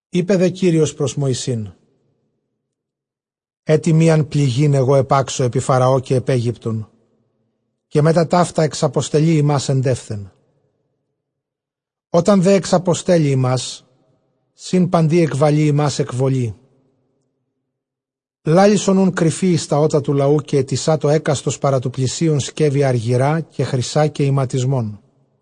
Εἶπε δὲ Κύριος πρὸς Μωυσῆν, ἔτι μίαν πληγὴν ἐγὼ ἐπάξω ἐπὶ Φαραὼ, καὶ ἐπʼ Αἴγυπτον, καὶ μετὰ ταῦτα ἐξαποστελεῖ ὑμᾶς ἐντεῦθεν· ὅταν δὲ ἐξαποστέλλῃ ὑμᾶς σὺν παντὶ, ἐκβαλεῖ ὑμᾶς ἐκβολῇ. Λάλησον οὖν κρυφῇ εἰς τὰ ὦτα τοῦ λαοῦ, καὶ αἰτησάτω ἕκαστος παρὰ τοῦ πλησίον σκεύη ἀργυρᾶ καὶ χρυσὰ καὶ ἱματισμόν.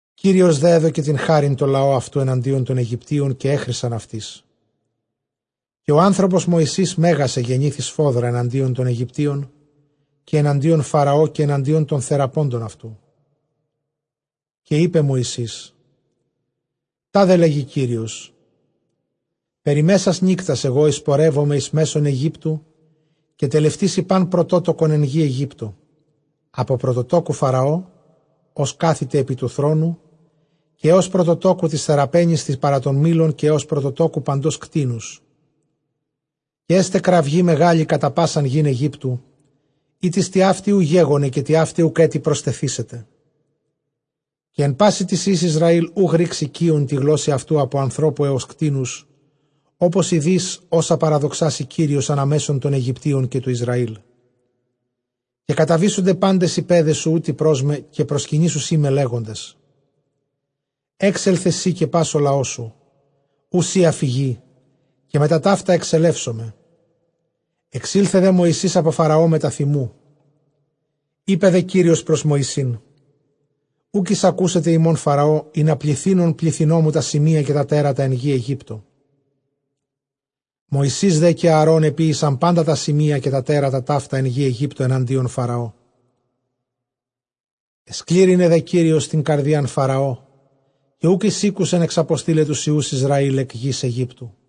Κύριος δὲ ἔδωκε τὴν χάριν τῷ λαῷ αὐτοῦ ἐναντίον τῶν Αἰγυπτίων, καὶ ἔχρησαν αὐτοῖς· καὶ ὁ ἄνθρωπος Μωυσῆς μέγας ἐγενήθη σφόδρα ἐναντίον τῶν Αἰγυπτίων, καὶ ἐναντίον Φαραὼ, καὶ ἐναντίον τῶν θεραπόντων ἀτοῦ. Καὶ εἶπε Μωυσῆς, τάδε λέγει Κύριος, περὶ μέσας νύκτας ἐγὼ εἰσπορεύομαι εἰς μέσον Αἰγύπτου· Καὶ τελευτήσει πᾶν πρωτότοκον ἐν γῇ Αἰγύπτῳ, ἀπὸ πρωτοτόκου Φαραὼ, ὃς κάθηται ἐπὶ τοῦ θρόνου, καὶ ἕως πρωτοτόκου τῆς θεραπαίνης τῆς παρὰ τὸν μύλον, καὶ ἕως πρωτοτοκου παντος κτήνους. Καὶ ἔσται κραυγὴ μεγάλη κατὰ πᾶσαν γῆν Αἰγύπτου, ἥτις τοιαύτη οὐ γέγονε, καὶ τοιαύτη οὐκ ἔτι προστεθήσεται. Καὶ ἐν πᾶσι τοῖς υἱοῖς Ἰσραὴλ οὐ γρύξει κύων τῇ γλώσσῃ αὐτοῦ, ἀπὸ ἀνθρώπου ἕως κτήνους· ὅπως εἰδῇς ὅσα παραδοξάσει Κύριος ἀνὰ μέσον τῶν Αἰγυπτίων καὶ τοῦ Ἰσραήλ. Καὶ καταβήσονται πάντες οἱ παῖδές σου οὗτοι πρός με, καὶ προσκυνήσουσί με, λέγοντες, ἔξελθε σὺ, καὶ πᾶς ὁ λαός σου, οὗ σὺ ἀφηγῇ· καὶ μετὰ ταῦτα ἐξελεύσομαι· ἐξῆλθε δὲ Μωυσῆς ἀπὸ Φαραὼ μετὰ θυμοῦ. Εἶπε δὲ Κύριος πρὸς Μωυσῆν, οὐκ εἰσακούσεται ὑμῶν Φαραὼ, ἵνα πληθύνων πληθυνῶ μου τὰ σημεῖα, καὶ τὰ τέρατα ἐν γῇ Αἰγύπτῳ. Μωσῆς δὲ καὶ Ἀαρὼν ἐποίησαν πάντα τὰ σημεῖα καὶ τὰ τέρατα ταῦτα ἐν γῇ Αἰγύπτῳ ἐναντίον Φαραώ· ἐσκλήρυνε δὲ Κύριος τὴν καρδίαν Φαραὼ, καὶ οὐκ εἰσήκουσεν ἐξαποστεῖλαι τοὺς υἱοὺς Ἰσραὴλ ἐκ γῆς Αἰγύπτου.